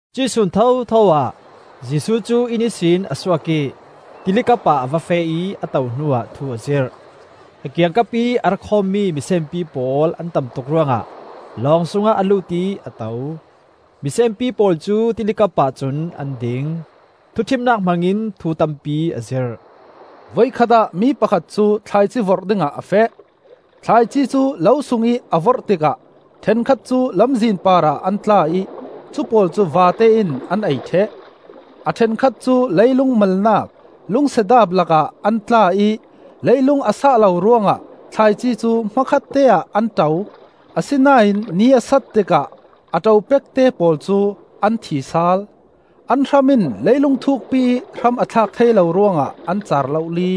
Cuih sun thotho ah Jesuh cu inn ihsin a suak ih tili kapah a va feh ih a to hnuah thu a zirh. A kiangkapih a ra khawmmi misenpi pawl an tam tuk ruangah lawng sungah a lut ih a to. Misenpi pawl cu tili kapah cun an ding. Thuṭhimnak hmangin thu tampi a zirh: “Voikhat ah mi pakhat cu thlaici vorh dingah a feh. Thlaici cu lo sungih a vorh tikah ṭhenkhat cu lamzin parah an tla ih cu pawl cu vate in an ei ṭheh. A ṭhenkhat cu leilung malnak lungsedaap lakah an tla ih leilung a sah lo ruangah thlaici cu hmakhatte ah an ṭo. Asinain ni a sat tikah a ṭo pekte pawl cu an thi sal; an hram in leilung thukpi ih hram a thlak thei lo ruangah an car lohli.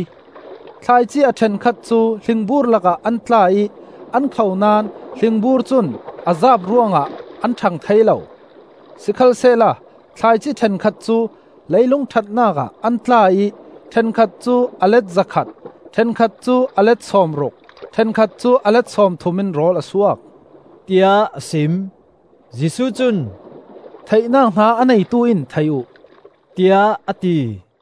Thlaici a ṭhenkhat cu hlingbur lakah an tla ih an kho naón hlingbur cun a zaap ruangah an ṭhang thei lo. Sikhalsehla thlaici ṭhenkhat cu leilung ṭhatnak ah an tla ih ṭhenkhat cu a let zakhat, ṭhenkhat cu a let sawmruk, ṭhenkhat cu a let sawmthum in rawl a suak,” tiah a sim. Jesuh cun, “Theihnak hna a neitu in thei uh,” tiah a ti.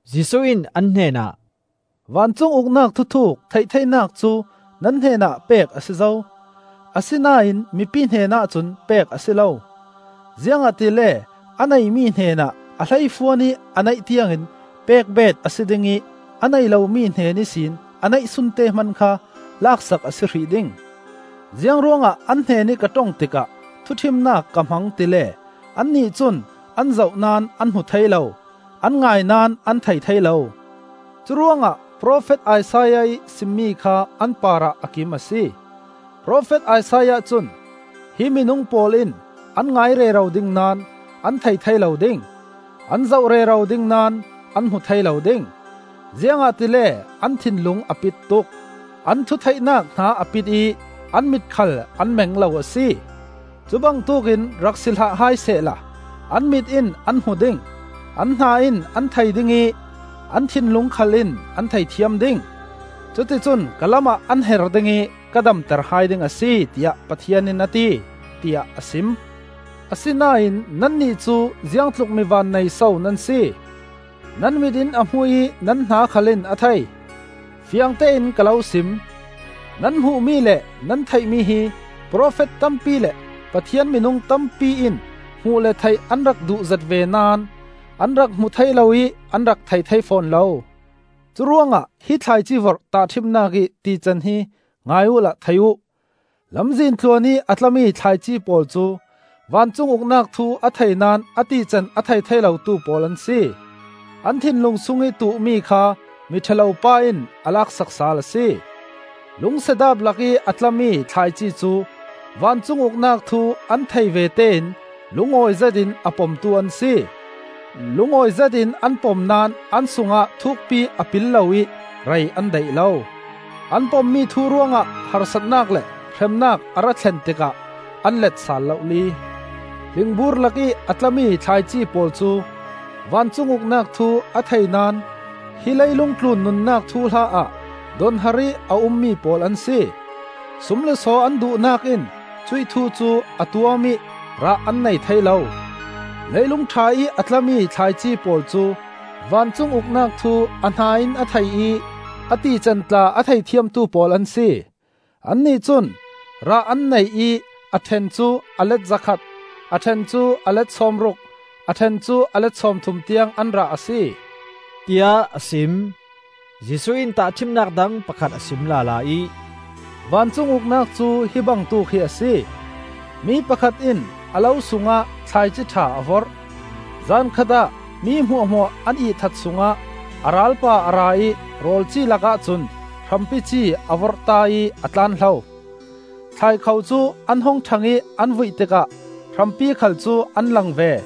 Jesuh in an hnenah, “Vancung Uknak thuthuuk theih theinak cu nan hnenah pek a si zo. Asinain mipi hnenah cun pek a si lo. Ziangahtile a neimi hnenah a hleifuan ih a neih tiangin pek beet a si ding ih a nei lomi hnen ihsin a neihsunte hman kha lak sak a si hrih ding. Ziang ruangah an hnenih ka ṭong tikah thuṭhimnak ka hmang tile annih cun an zoh naón an hmu thei lo, an ngai naón an thei thei lo. Curuangah profet Isaiah ih simmi kha an parah a kim a si. Profet Isaiah cun: ‘Hi minung pawl in an ngai rero ding naón an thei thei lo ding. An zoh rero ding naón an hmu thei lo ding. Ziangahtile an thinlung a pit tuk, an thutheihnak hna a pit ih an mit khal an meng lo a si. Cu bangtuk in rak si hlah hai sehla an mit in an hmu ding, an hna in an thei ding ih, an thinlung khal in an thei thiam ding. Cuticun ka lamah an her ding ih ka damter hai ding a si, tiah Pathian in a ti’, tiah a sim. “Asinain nannih cu ziangtluk mi vannei so nan si! Nan mit in a hmu ih nan hna khal in a thei. Fiangtein ka lo sim: nan hmuhmi le nan theihmi hi profet tampi le Pathian minung tampi in hmuh le theih an rak duhzet ve naón an rak hmu thei lo ih an rak thei thei fawn lo. “Curuangah hi thlaici vorh tahṭhimnak ih tican hi ngai uhla thei uh. Lamzin tluan ih a tlami thlaici pawl cu vancung Uknak thu a thei naón a tican a thei thei lotu pawl an si. An thinlung sungih tuhmi kha Miṭha lo pa in a laksak sal a si. Lungsedaap lakih a tlami thlaici cu vancung Uknak thu an theih vete in lungawi zetin a pomtu an si. Lungawi zetin an pom naón an sungah thukpi a pil lo ih rei an daih lo. An pommi thu ruangah harsatnak le hremnak a ra thlen tikah an let sal lohli. Hlingbur lakih a tlami thlaici pawl cu vancung Uknak thu a thei naón hi leilung tlun nunnak thuhla ah donhar ih a ummi pawl an si. Sum le saw an duhnak in cuih thu cu a tuam ih rah an nei thei lo. Leilung ṭha ih a tlami thlaici pawl cu vancung Uknak thu a hna in a thei ih a tican tla a thei thiamtu pawl an si. Annih cun rah an nei ih a ṭhen cu a let zakhat, a ṭhen cu a let sawmruk, a ṭhen cu a let sawmthum tiang an rah a si,” tiah a sim. Jesuh in tahṭhimnak dang pakhat a sim lala ih, “Vancung Uknak cu hi bangtuk hi a si. Mi pakhat in a lo sungah thlaici ṭha a vorh. Zan khatah mi hmuahhmuah an ihthat sungah a ralpa a ra ih rawl ci lak ahcun hrampi ci a vorhta ih a tlanhlo. Thlai kho cu an hung ṭhang ih an vuih tikah hrampi khal cu an lang ve.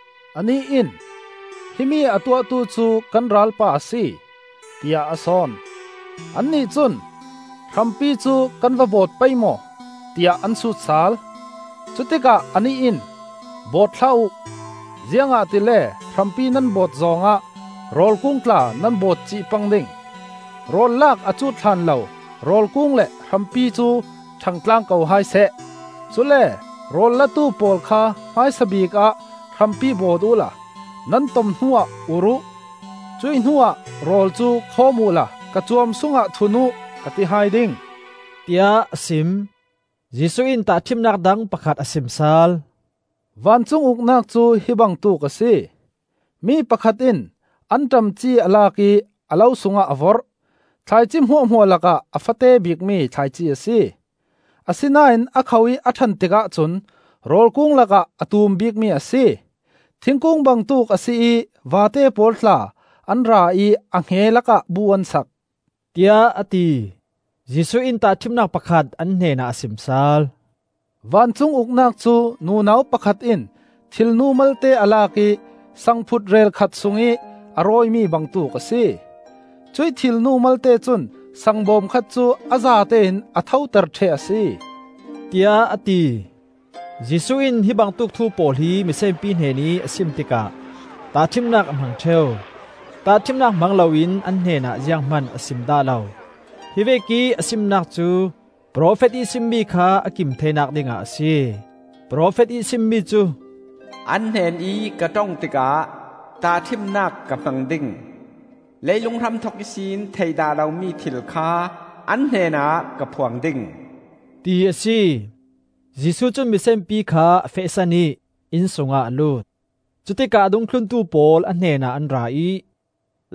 Anih in, ‘Himi a tuahtu cu kan ralpa a si,’ tiah a sawn. Annih cun, ‘Hrampi cu kan va bawt pei maw?’ tiah an sut sal. Cutikah anih in, ‘Bawt hlah uh, ziangahtile hrampi nan bawt zawng ah rawl kung tla nan bawtcih pang ding. Rawl laak a cut hlan lo rawl kung le hrampi cu ṭhang tlang ko hai seh. Cule rawl latu pawl kha hmaisabik ah hrampi bawt uhla nan tom hnuah ur uh; cuih hnuah rawl cu khawm uhla ka cuam sungah thun uh,’ ka ti hai ding,” tiah a sim. Jesuh in tahṭhimnak dang pakhat a sim sal. “Vancung Uknak cu hi bangtuk a si. Mi pakhat in anṭam ci a lak ih a lo sungah a vorh. Thlaici hmuahhmuah lakah a fate bikmi thlaici a si. Asinain a kho ih a ṭhan tikah cun rawl kung lakah a tum bikmi a si. Thingkung bangtuk a si ih vate pawl tla an ra ih a hnge lakah bu an sak,” tiah a ti. Jesuh in tahṭhimnak pakhat an hnenah a sim sal. “Vancung Uknak cu nunau pakhat in thilnu malte a lak ih sangphut reel khat sungih a rawimi bangtuk a si. Cuih thilnu malte cun saang bawm khat cu a zatein a thoter ṭheh a si,” tiah a ti. Jesuh in hi bangtuk thu pawl hi misenpi hnenih a sim tikah tahṭhimnak a hmang ṭheu. Tahṭhimnak hmang loin an hnenah ziang hman a sim dah lo. Hi vekih a simnak cu profet ih simmi kha a kim theinak dingah a si. Profet ih sim mi cu: “An hnenih ka ṭong tikah tahṭhimnak ka hmang ding; Leilung hramthok ihsin theih dah lomi thil kha an hnenah ka phuang ding,” ti a si. Jesuh cun misenpi kha a fehsan ih inn sungah a lut. Cutikah a dungthluntu pawl a hnenah an ra ih,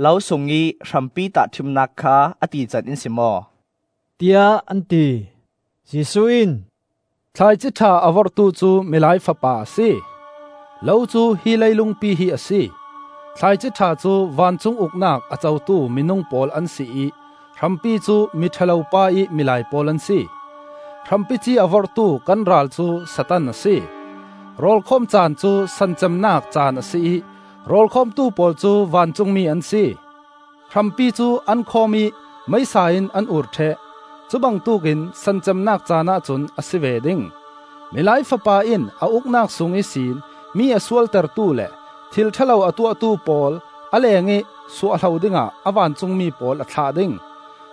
“Lo sungih hrampi tahṭhimnak kha a tican in sim aw,” tiah an ti. Jesuh in, “Thlaici ṭha a vorhtu cu Milai Fapa a si. Lo cu hi leilungpi hi a si; thlaici ṭha cu vancung Uknak a cotu minung pawl an si ih hrampi cu Mi ṭha lo pa ih milai pawl an si. Hrampi ci a vorhtu kan ral cu Satan a si. Rawlkhawm caan cu san cemnak caan a si ih rawlkhawmtu pawl cu vancungmi an si. Hrampi cu an khawm ih meisa in an ur ṭheh; cu bangtuk in san cemnak caanah cun a si ve ding. Milai Fapa in a Uknak sung ihsin mi a sualtertu le thil ṭha lo a tuahtu pawl a lengih suahhlo dingah a vancungmi pawl a thlah ding.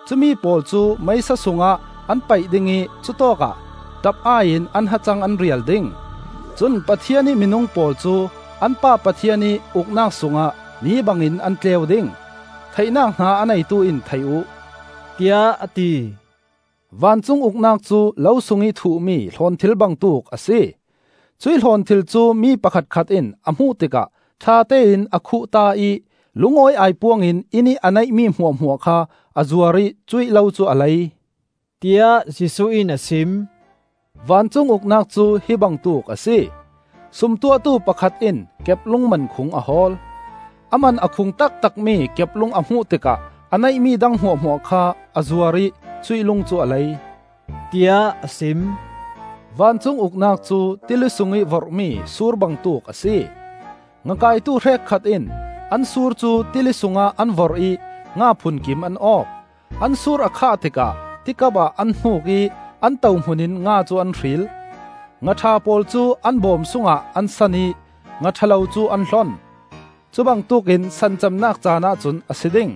Cumi pawl cu meisa sungah an paih ding ih cutawkah ṭap-ai in an hacang an rial ding. Cun Pathian ih minung pawl cu an Pa Pathian ih Uknak sungah ni bangin an tleu ding. Theihnak hna a neitu in thei uh,” tiah a ti. “Vancung Uknak cu lo sungih thuhmi hlawnthil bangtuk a si. Cuih hlawnthil cu mi pakhatkhat in a hmuh tikah ṭhatein a khuhta ih lungawi aipuang in innih a neihmi hmuahhmuah kha a zuar ih cuih lo cu a lei,” tiah Jesuh in a sim. “Vancung Uknak cu hi bangtuk a si. Sum tuahtu pakhat in keplung mankhung a hawl. A man a khung taktakmi keplung a hmuh tikah a neihmi dang hmuahhmuah kha a zuar ih cuih lung cu a lei,” tiah a sim. “Vancung Uknak cu tili sungih vorhmi sur bangtuk a si. Nga kaitu hrekkhat in an sur cu tili sungah an vorh ih nga phunkim an awk. An sur a khah tikah ti kapah an hnuk ih an tohmun in nga cu an hril; nga ṭha pawl cu an bawm sungah an san ih nga ṭha lo cu an hlon. Cu bangtuk in san cemnak caanah cun a si ding;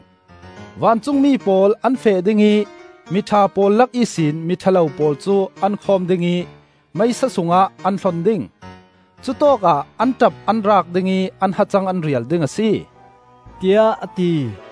vancungmi pawl an feh ding ih mi ṭha pawl lak ihsin mi ṭha lo pawl cu an khawm ding ih, meisa sungah an hlon ding. Cutawkah an ṭap an raak ding ih an hacang an rial ding a si,” tiah a ti.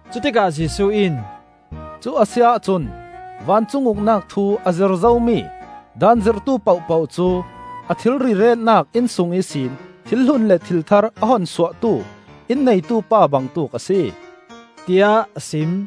Cutikah Jesuh in, “Cu a si ahcun vancung Uknak thu a zir zomi Daan zirhtu pohpoh cu a thilri retnak inn sung ihsin thil hlun le thil thar a hun suahtu, inn neitu pa bangtuk a si,” tiah a sim.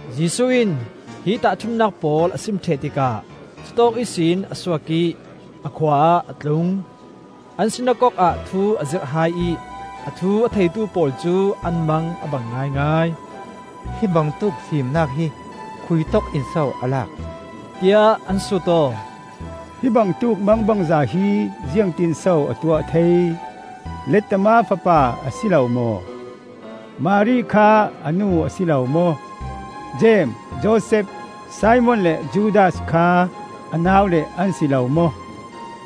Jesuh in hi tahṭhimnak pawl a sim ṭheh tikah cutawk ihsin a suak ih, a khua ah a tlung. An sinakok ah thu a zirh hai ih a thu a theitu pawl cu an mang a bang ngaingai. “Hi bangtuk fimnak hi khuitawk in so a lak?” tiah an sut aw. “Hi bangtuk mangbangza hi ziangtinso a tuah thei? Lettama fapa a si lo maw? Mari kha a nu a si lo maw? Jeim, Josef, Simon le Judas kha a naule an si lo maw?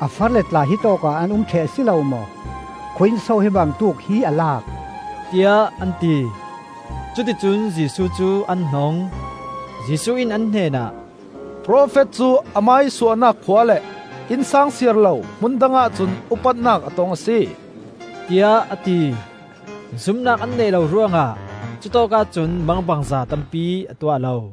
A far le tla hitawk ah an um ṭheh a si lo maw? Khui-inso hi bangtuk hi a lak?” tiah an ti. Cuti cun Jesuh cu an hnong. Jesuh in an hnenah, “Profet cu amah ih suahnak khua le innsang siar lo hmun dangah cun upatnak a tong a si,” tiah a ti. Zumnak an neih lo ruangah cutawkah cun mangbangza tampi a tuah lo.